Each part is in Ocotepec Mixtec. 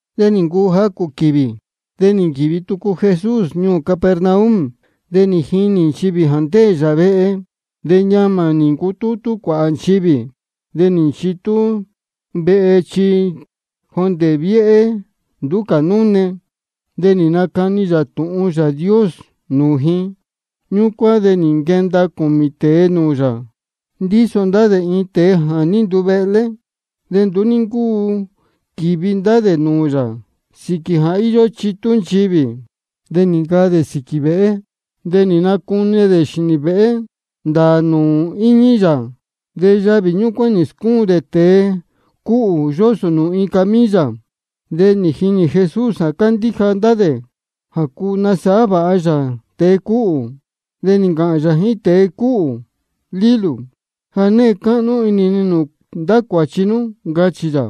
De nī ncuu jacū quīvī, de nī nquīvi tucu Jesús ñuū Capernaum. De nī jinī nchivī jā ndéē yā vehe. De ñamā nī ncutútú cuāhā nchivī, de nī nchitú vehe chi jondē viéhé nduú cā núne. De nī nacani yā tūhun Yāā Dios nūū ji. Ñúcuán de nī nquenda cūmī tēe nūū yā, ndíso ndá dē iin tēe jā ní nduvehlé. De nduú ní ncúu quīvi ndá dē nūū yā sīquī jā íyó chitú nchivī. De nī ncaa dē sīquī vēhé, de nī nacune dē xīnī vēhé ndāā nūū íñí yā, de yavī ñúcuán nī scúun dē tēe cúhū, yósō dē nūū iin camilla. De nī jinī Jesús jā cándíja ndá dē jā cuu nasāhá vāha yā tēe cúhū. De nī ncāhān yā jíín tēe cúhū: Lílū, ja née cáhnú inī ni nūū ndá cuāchi nú, ncachī yā.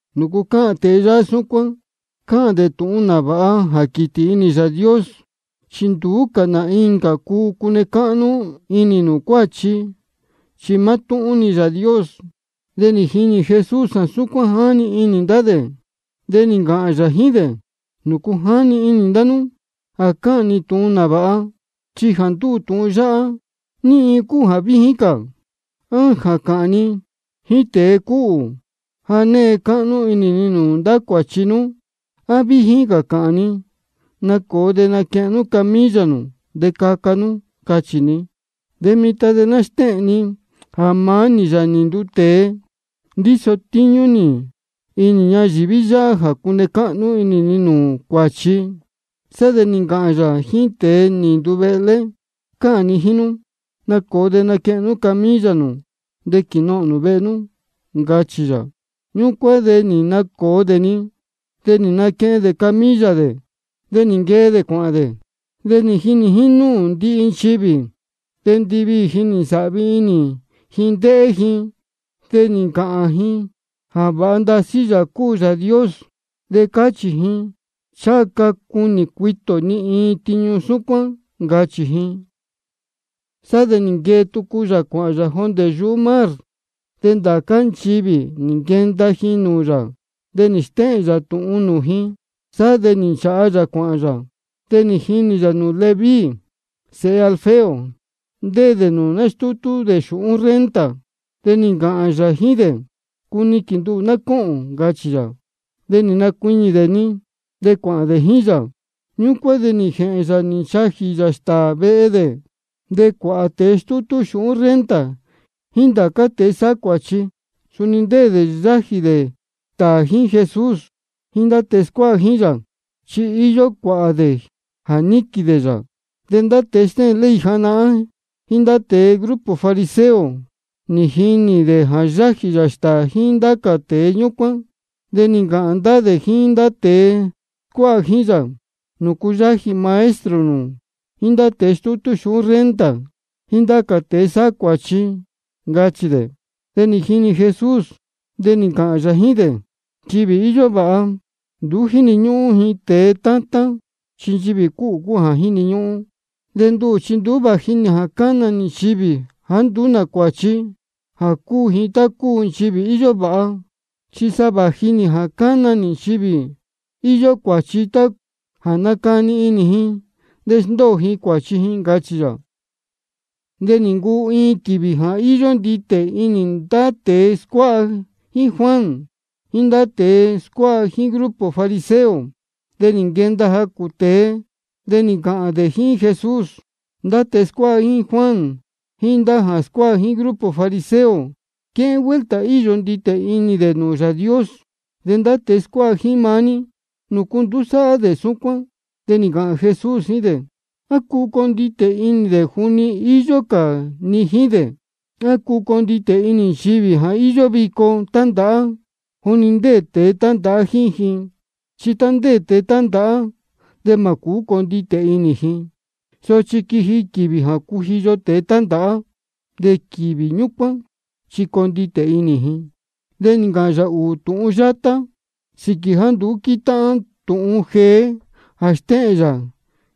¿Nūcu cáhān tēe yáhá súcuán? Cáhān dē tūhun nāvāha jā quītī inī Yāā Dios. Chi nduú cā nā incā cuu cune cáhnú inī nūū cuáchi, chi mátúhún-ni Yāā Dios. De nī jinī Jesús jā súcuán jáni inī ndá dē, de nī ncāhān yā jíín dē: ¿Nūcu jáni inī ndá nú jā cáhān ni tūhun nāvāha? Jā ndúū tūhun yáhá, ¿ní iin cúu jā víjín cā? ¿A jā cāhān ni jíín tēe cúhū: Ja née cáhnú inī ni nūū ndá cuāchi nú? ¿A víjín cā jā cāhān ni: Nacōo de naquehen nú camilla nū, de caca nú, cachī ni? De mitan de ná stéhēn ni jā maá nī, Yāā nī nduu tēe, ndíso tíñú nī inī ñayīví yáhá jā cune cáhnú inī ni nūū cuáchi. Sá de nī ncāhān yā jíín tēe nī nduvehlé: Cáhān ni jíín nú, nacōo de naquehen nú camilla nū de quīnohōn nū vehe nú, ncachī yā. Ñúcuán de nī nacōo dē-ni, de nī naquehen dē camilla dē, de nī nquee dē cuāhān dē, nī jinī jínúū ndihi nchivī. De ndiviī ji nī nsāhvi inī ji ndéhé ji, de nī ncāhān ji jā vāha ndasí Yāā cúu Yāā Dios. De cáchī ji: Ncháha ca cunī cuitī ō ni iin tiñu súcuán, ncachī ji. Sá de nī nquee tucu yā cuāhān yā jondē yuhú mar. De ndācá nchivī nī nquenda ji nūū yā, de nī stéhēn yā tūhun nūū ji. Sá de nī nchāha yā cuāhān yā, de nī jinī yā nūū Leví sēhe Alfeo, ndéē dē nūū nástútú dē xūhún renta. De nī ncāhān yā jíín dē: Cuniquīn nduhū ná cóhōn, ncachī yā. De nī nacuiñī dē-ni, de cuāhān dē jíín yā. Ñúcuán de nī jēhēn yā nī nchajī yā stāā vehe dē. De cuāhā tēe stútú xūhún renta jíín ndá cā tēe sáhá cuāchi, suni ndéē dē yájī dē stāā jíín Jesús jíín ndá tēe scuáha jíín yā, chi íyó cuāhā dē jā níquīn dē yā. De ndá tēe stéhēn ley janahán jíín tēe grupo fariseo, nī jinī dē jā yájī yā stāā jíín ndācá tēe ñúcuán. De nī ncāhān ndá dē jíín ndá tēe scuáha jíín yā: ¿Nūcu yájī maestro nū jíín ndá tēe stútú xūhún renta jíín ndá cā tēe sáhá cuāchi? ncachī dē. De nī jini Jesús, de nī ncāhān yā jíín dē: Nchivī íyó vāha, nduú jíni ñúhún ji tēe tátán, chi nchivī cúhū cúu jā jíni ñúhún. De nduhū chi nduú vāji nī jā cana nī nchivī jāá nduú cuāchi, jā cúu ji tá cúu nchivī íyó vāha. Chi sa vāji nī jā cána nī nchivī íyó cuāchi, jā ná nácani inī ji de sndóo ji cuāchi ji, ncachī yā. De nī ncuu iin quīvī jā íyó nditē inī ndá tēe scuáha jíín Juan, jíín ndá tēe scuáha jíín grupo fariseo. De nī nquenda jacū tēe, nī ncāhān dē jíín Jesús: Ndá tēe scuáha jíín Juan jíín jā scuáha jíín grupo fariseo, quéhén vuelta íyó nditē inī dē nūū Yāā Dios. De ndá tēe scuáha jíín maá ní, ¿nūcu nduú sáhá dē súcuán? De nī ncāhān Jesús jíín dē: ¿A cuu conditē inī dē juni íyó cā ni jíín dē? ¿A cuu conditē inī nchivī jā íyó vico tándāhá juni ndéē tēe tándāhá jíín ji? Chi tá ndéē tēe tándāhá, de mā cūú conditē inī ji. Sochi quiji quīvī jā cujiyo tēe tándāhá, de quīvī ñúcuán chi conditē inī ji. De nī ncāhān yā ūū tūhun yátá sīquī jāá nduú quítáhán tūhun jeé jā stéhēn yā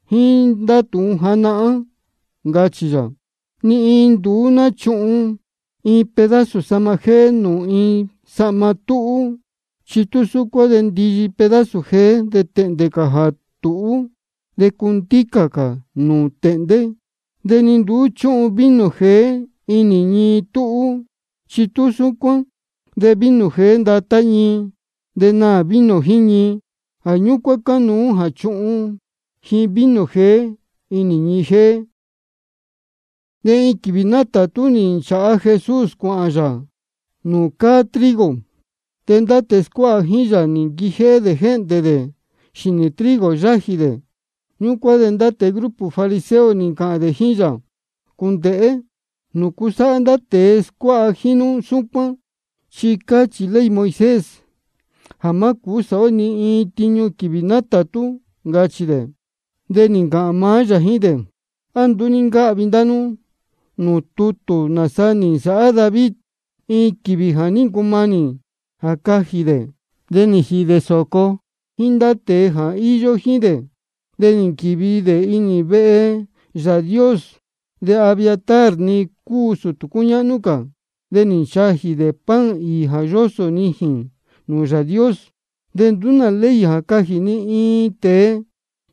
jíín ndá tūhun janahán. Ncachī yā: Ni iin nduú náchuhun iin pedazo sahma jéé nūū iin sahma túhú. Chi tú súcuán de ndiyi pedazo jeé de tēhndē cā jā tūhú, de cundícā cā nūū tēhndé. De ni nduú chúhun vino jeé inī ñii túhú. Chi tú súcuán de vino jeé ndatá ñii, de naā vino jíín ñii. Jā ñúcuán cánuú jā chuhun ji vino jeé inī ñii jéé. De iin quīvī nátātú nī nchāha Jesús cuāhān yā nūū cáá trigo. De ndá tēe scuáha jíín yā nī nquijéhé dē jéhndē dē xīnī trigo yájī dē. Ñúcuán de ndá tēe grupo fariseo nī ncāhān dē jíín yā: Cūndēhé. ¿Nūcu sáhá ndá tēe scuáha jíín nú súcuán? Chi cáchī ley Moisés jā má cūú sāhá ó ni iin tiñu quīvī nátātú, ncachī dē. De nī ncāhān maá yā jíín dē: ¿A nduú ní ncáhvi ndá nú tutū nāsa nī nsāhá David, iin quīvī jā ní ncumanī jā cajī dē, de nī jīhī dē sōco jíín ndá tēe jā ní īyo jíín dē? De nī nquīvi dē inī vehe Yāā Dios. De Abiatar nī ncuu sūtū cúñáhnú cā. De nī nchajī dē pan īī jā yósō nijīn nūū Yāā Dios. De nduú nā ley jā cajī ni iin tēe,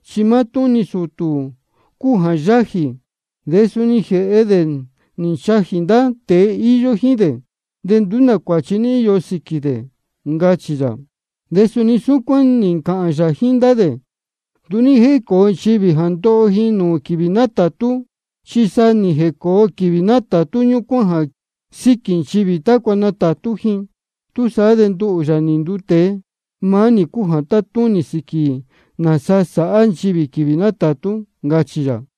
chi maá-ni sūtū cúu jā yájī. De suni nī jēhe dē nī nchajī ndá tēe íyó jíín dē. De nduú nā cuāchi ní íyo sīquī dē, ncachī yā. De suni nī ncāhān yā jíín ndá dē: Nduú ní jécōo nchivī jā ndoho ji nūū quīvī nátātú, chi sa nī jēcōo quīvī ñúcuán jā síquī nchivī tácua natātú ji. Túsaá de nduhū, Yāā nī nduu tēe, maá nī cúu jā tátúnī sīquī nāsa sāhá nchivī quīvī nátātú, ncachī yā.